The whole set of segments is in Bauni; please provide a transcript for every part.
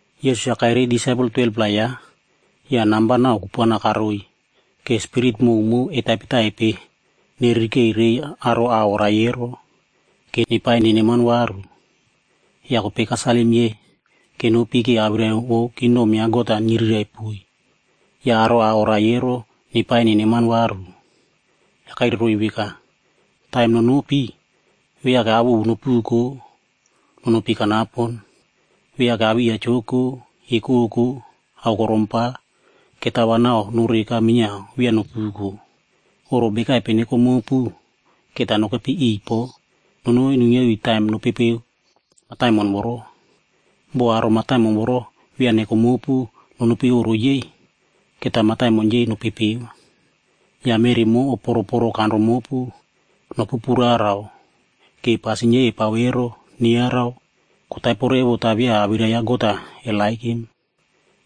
Yesus-a kairiy disaipel 12-pla yaꞌa, ya namba nau kupuana karoiy ke spirit mowmow etaipetaipe neririkeikirei aro a oraie ero, ke nepaie neneman varu. Ya kopei kasalim yei kenopi ke awirai vou kingdom ya God-a nyirirai poiy. Ya aro a oraie ero nepaie neneman varu. Ya kairai roiy veka, “Taim nonopi, viake ao ovu nopuko, nonopi kanapon. Viake awiya joko, ekoko, aokorom pa, ketao va nau noreka minyiao via nopuko. Oꞌro bekaipe neko mopu, keta nokepi iꞌiy po nonoi nuinyia iu taim nopepeo mataimon voro. Bo aro mataimon voro via neko mopu nonopi oꞌro yei, keta mataimon yei nopepeo. Ya meꞌri mo oporoporo kanro mopu, nopu puraraoa ke pasin yei epao ero neyarau kotaipo revo ta via awirai ya God-a eperepow vai.”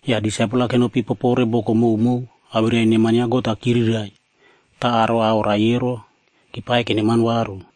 Ya disaipel-a kenopi popore boko mowmow awirai neman ya God-a kyirirai ta aro a oraie ero kepaie keneman varu.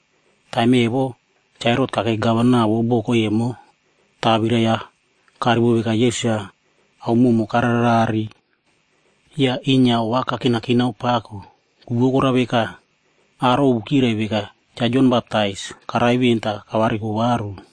Taim evo, Cha Herot kakei gavanab vou boko emo ta awirai-ya karivo veka Yesus-a ao mowmow kararerare. Ya inyia ova kakinakinao pako, ku vou korao veka, aro ovu kyirai veka Cha Jon Baptais karai ven ta kavariko varu.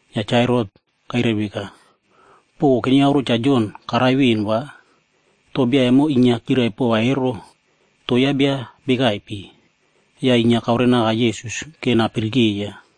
Ya Cha Herot kairai veka, “Poko kenyauro Cha Jon karai ven va, to bia emo inyia kyirai pova ero, to yaꞌa bia bekaipe?” Ya inyia kaorenaka Yesus ke napirikeiya.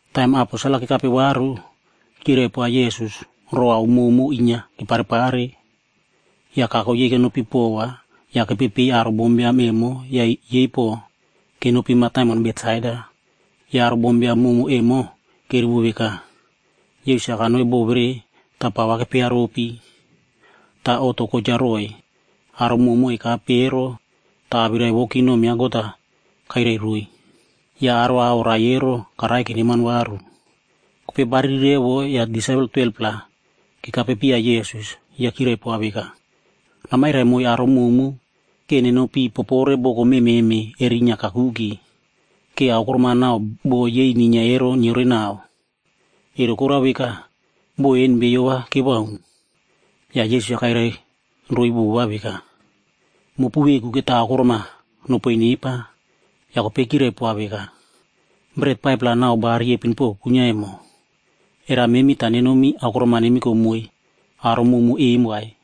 Taim aposel-a kekape varu, kyirai poa Yesus row ao mowmow inyia keparepare. Ya kako yei kenopi pova ya kepepei aro bombiam emo ya yei po kenopi mataimon Betsaida. Ya aro bombiam mowmow em kerivo veka, Yesus-a kanoi bo vere ta pa va kepearopi. Ta oꞌto kocha roiy aro mowmow ekape ero ta awirai vou kingdom ya God-a kairai roiy. Ya aro a oraie ero karaie keneman varu. Kopei bariri revo ya disaipel 12-pla kekapepiya Yesus ya kyirai poa veka, “Namairai moiy aro mowmow ke nenopi popore boko mememe erinyia kakuke, ke aokorom-a nau bo yei ninyia ero nyiorenao. Ero korao veka, bo en beiyo va kewaun.” Ya Yesus-a kairai roiy veka, “Mopu veku keta aokorom-a nopoiy nepa.” Ya kopei kyirai poa veka, “Bret 5-plac nau ba riepin po kuinyia emo. Era memi ta nenomi aokorom-a nemiko moiy aro mowmow em vai?”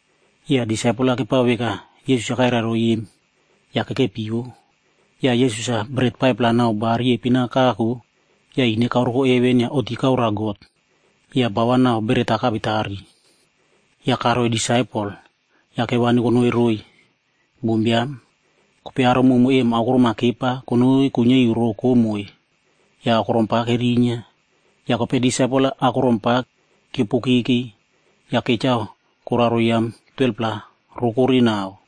Ya disaipel-a kepao veka Yesus-a kairai roiy em ya kekepio. Ya Yesus-a beret 5-pla nau ba riepin-a kako ya ine kaoreko heven ya oꞌti kaoroa God ya ba va nau beret-a kawetari. Ya karoiy disaipel, ya kewani konoi roiy aro bombiam. Kopei aro mowmow em aokorom-a kepa konoi kuinyia iu rokomoi ya aokorom pa kerinyia. Ya kopei disaipel-a aokorom pa kyiopokeke ya kechao koraro yam 12-pla rokore nau.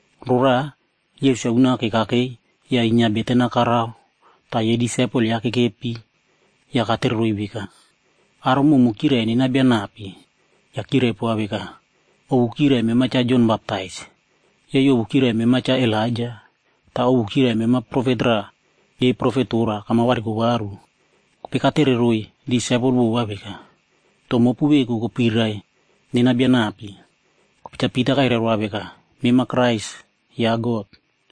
Roraꞌa Yesus-a unake kakei ya inyia beten-a karao ta yei disaipel yaꞌa kekepi ya katereroiy veka, “Aro mowmow kyirai nena bia nape?” Ya kyirai poa veka, “Ovu kyirai veka mema Cha Jon Baptais, yei ovu kyirai mema Cha Elaija, ta ovu kyirai mema profet raꞌa yei profet tora kama variko varu.” Kopei katereroiy disaipel vova veka, “To mopu veku kopirai nena bia nape?” Kopei Cha Pita kairai roa veka, “Mema Kraise ya God.”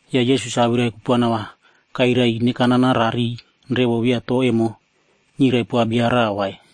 Ya Yesus-a awirai kupuana va kairai ine kanana rariy revo via to emo nyirai poa bia raꞌa vai.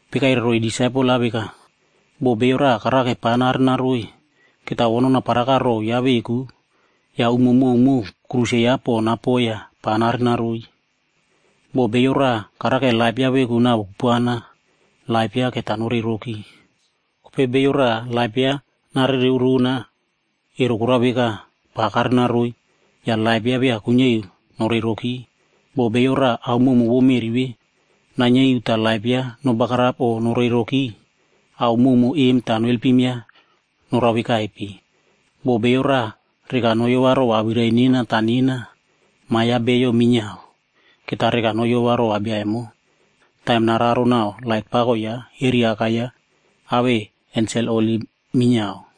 Kopei kairai roiy disaipel-a veka, “Bo bio raꞌa karake pa narenaroi, keta o nonaparaka row yaꞌa veku ya umo mowmow aꞌai tirikif yaꞌa po napoi ya pa narenaroi. Bo bio raꞌa karake laip yaꞌa veku navo kupuana, laip yaꞌa keta norei roki. Kopei bio raꞌa laip yaꞌa narereo rona, ero korao veka, pa karenaroi ya laip yaꞌa via kuinyia iu norei roki. Bo bio raꞌa ao mowmow vou meꞌri ve nainyia iu ta laip yaꞌa nobagarap o norei roki, ao mowmow em ta noelpim yaꞌa norao vekaipe? Bo bio raꞌa reka noyova row awirai nena ta nena, Ma ya Bio minyiao keta reka noyova rova bia emo, taim nararo nau lait pako yaꞌa eri Aka yaꞌa awei ensel holi minyiao.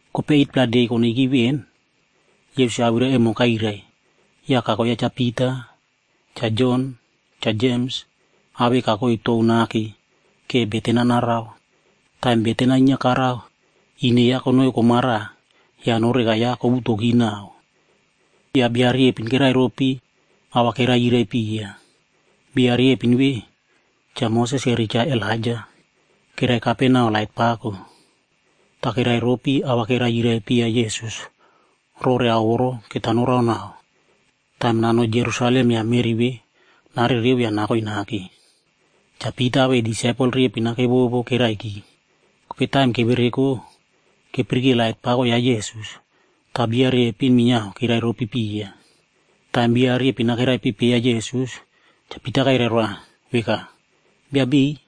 Kopei 8-pla de konoiki ven, Yesus-a awirai emo kairai, ya kako yaꞌa Cha Pita, Cha Jon, Cha Jems awei kakoi tou nake ke beten-a narao. Taim beten-a inyia karao, ine yaꞌa konoi komara ya noreka yaꞌa kowutoki nau. Ya bia riepin kerai ropi a va kerai yirai piya. Bia riepin ve, Cha Moses eri Cha Elaija. Keraikape nau lait pako. Ta kerai ropi a va kerai yirai piya Yesus rore ao voro keta noraonao, taim nanoi Jerusalem ya meꞌri ve narereo ya nakoi nake. Cha Pita awei disaipel riepin-a kevovo keraiki. Kopei taim kevereko, kepirike lait pako ya Yesus. Ta bia riepin minyiao kerai ropi piya. Taim bia riepin-a keraipepeiya Yesus, Cha Pita kairai roa veka, “Bia beiy,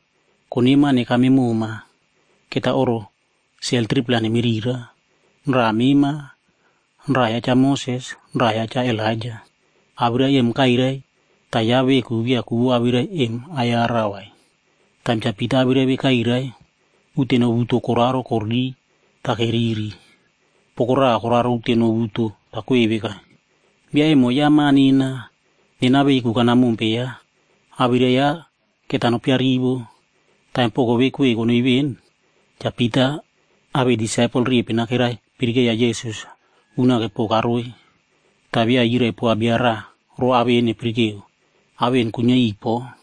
koneman nekame moma. Keta oꞌro sel 3-pla nemirira, raꞌa mema, raꞌa ya Cha Moses, raꞌa ya Cha Elaija.” Awirai em kairai ta yaꞌa veku via ku vou awirai em ayarau vai. Taim Cha Pita awirai ve kairai, uteno wuto koraro koririy ta keriri. Poko raꞌa koraro uteno wuto ta kwei veka, “Bia emo yaꞌa Ma nena, nena veku kanamompe yaꞌa. Awirai yaꞌa keta nopiarivo.” Taim poko ve kwei konoi ven, Cha Pita awei disaipel riepin-a kepirikeiya Yesus-a unake po karoi. Ta via yiraipoa bia raꞌa row ao en epirikeo. Ao en kuinyia iꞌiy po.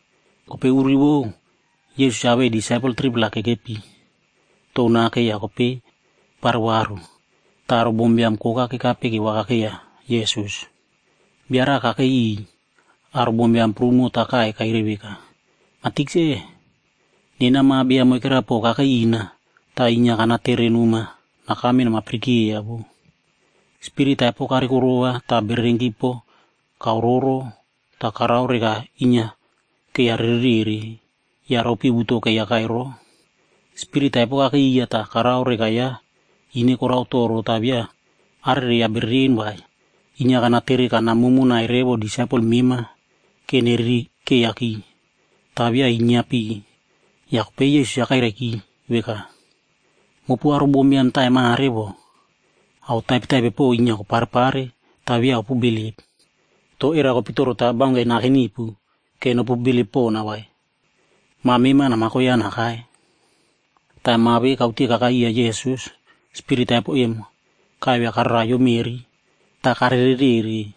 Kopei uri vou, Yesus awei disaipel 3-pla kekepi tou nake ya kopei keparo varu. Ta aro bombiam koka kekape kevakakeiya Yesus. Bia raꞌa kakei iꞌiy aro bombiam prumo ta kaiy kairai veka, “Ma Tikse, nena ma biam moikera po kakei ina, ta inyia kanaterenoma nakame namapirikeiya voꞌo. Spirit taipo karikorova ta bererenki po kaororo ta karao reka inyia keiyarererere ya ropi wuto keiyakai roꞌo. Spirit taipo kakei iya ta karao reka yaꞌa ine korao toro ta via arereiya bereren vai. Inyia kanatere kanamomonai revo disaipel mema ke neririkeiyaki, ta via inyiapi.” Ya kopei Yesus-a kairaiki veka, “Mopu aro bombiam taim mare voꞌo, ao taipetaipe po inyia koparepare ta via opu bilip. To era kopitoro ta baunke naken nipu ke nopu bilip pona vai? Ma mema namako yaꞌa nakai.” Taim ma ve kaute kakai iya Yesus, spirit taipo em kaivia kararaiyo meꞌri ta karerere.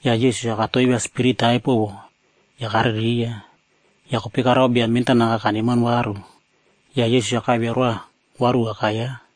Ya Yesus-a katoivia spirit taipo vo ya karereiya. Ya kopei karao bia mentanaka kaneman varu. Ya Yesus-a kaivia roa varu aka yaꞌa.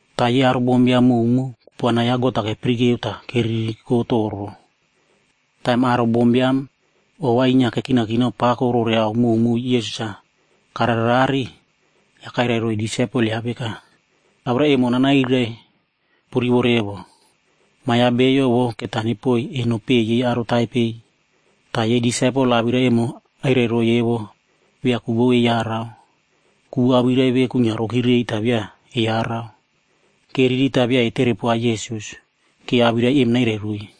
Ta yei aro bombiam mowmow kupuana ya God-a kepirikeo ta keririko toro. Taim aro bombiam ova inyia kekinakinao pako rore ao mowmow Yesus-a kararerare, ya kairai roiy disaipel yaꞌa veka, “Awirai emo nanairai nopurivo revo. Ma ya Bio vo keta nepoiy eno peꞌe yei aro taipei.” Ta yei disaipel awirai ve kairai roiy emo via ku vou eyarau. Ku vou awirai ve kuinyia roki rei ta via eyarau. Keriri ta via etere poa Yesus ke awirai em nairai roiy.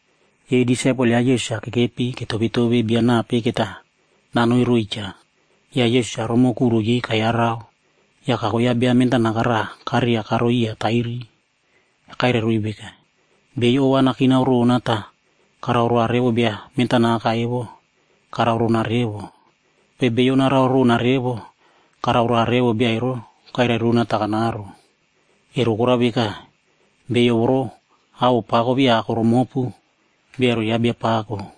Yei disaipel ya Yesus-a kekepi ketovetove bia nape keta nanoi roiy cha. Ya Yesus-a romo kuro yei kayarau, ya kako yaꞌa bia mentanaka raꞌa kareria karoi iya tairi. Ya kairai roiy veka, “Beiyo ova nakinao rona ta karao roa revo bia mentanaka evo, karao rona revo. Kopei bio narao rona revo, karao roa revo bia ero kairai rona ta kanaro. Ero korao veka, bio voro awoꞌo pako via ako romopu, bia ero yaꞌa bia pako.”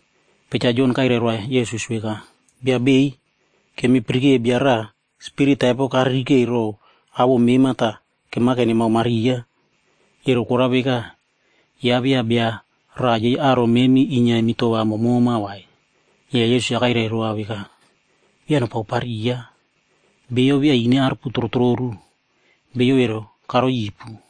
Kopei Cha Jon kairai roa Yesus veka, “Bia beiy, kemi pirike bia raꞌa spirit taipo karirikei row awoꞌo mema ta kemake nemaomariya. Ero korao veka, yaꞌa via bia raꞌa yei aro memi inyia emi towa momoma vai.” Ya Yesus-a kairai roa veka, “Via nopaopariya, bio via ine aruputrotroru, bia ero karoi ipu.”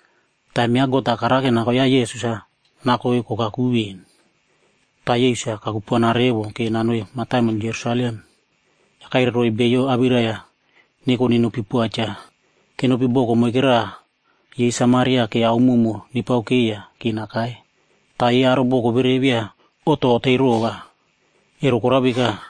Taim ya God-a karake nako yaꞌa Yesus-a nakoig kokaku ven, ta Yesus-a kakupuana revo ke nanoi mataimon Jerusalem. Ya kairai roiy beiyo awirai-ya neko nenopi poa cha. Kenopi boko moike raꞌa yei Samaria ke ao mowmow nepaokeiya ke nakai. Ta yei aro boko vere via oꞌto otei rova, ero korao veka,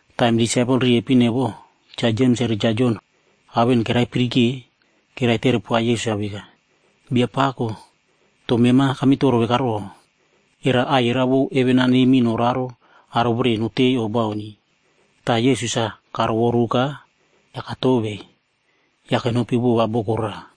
Taim disaipel riepin evo, Cha Jems eri Cha Jon ao en keraipirike, keraitere poa Yesus-a veka, “Biapako to mema kamitoro vekaro, era aiyerao vou heven-a neimi noraro aro vere notei o bauni?” Ta Yesus-a karovoruka ya katovei, ya kenopi vova boko raꞌa.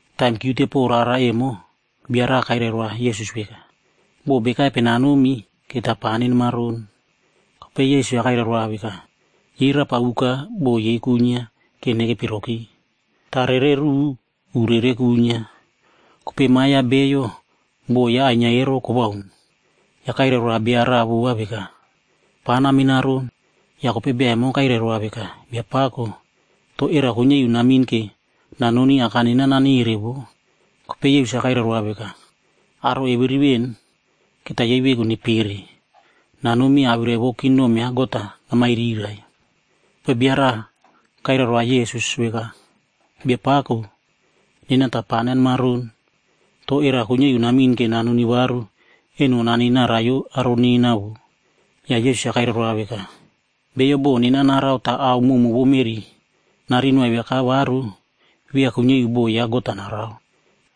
Taim kyiute pow rara emo, bia raꞌa kairai roa Yesus veka, “Bo bekaipe nanomi keta pa nanimaron.” Kopei Yesus-a kairai roa veka, “Yei rapa uka bo yei kuinyia ke nekepi roki, ta rere ruꞌu, u rere kuinyia. Kopei Ma ya Bio, bo yaꞌa ainyia ero kowaun.” Ya kairai roa bia raꞌa vova veka, “Pa naminaron.” Ya kopei bia emo kairai roa veka, “Biapako, to era kuinyia iu namin ke nanoni aka nena nanere voꞌo.” Kopei Yesus-a kairai roa veka, “Aro eviri ven, keta yei veku nepere, nanomi awirai vou kingdom ya God-a namairirai.” Kopei bia raꞌa kairai roa Yesus veka, “Biapako, nena ta pa nanemaron. To era kuinyia iu namin ke nanoni varu eno nanei naraiyo aro nena voꞌo” Ya Yesus-a kairai roa veka, “Bio bo nena narao ta ao mowmow vou meꞌri narin noaiviaka varu, via kuinyia iu bo ya God-a narao vai.”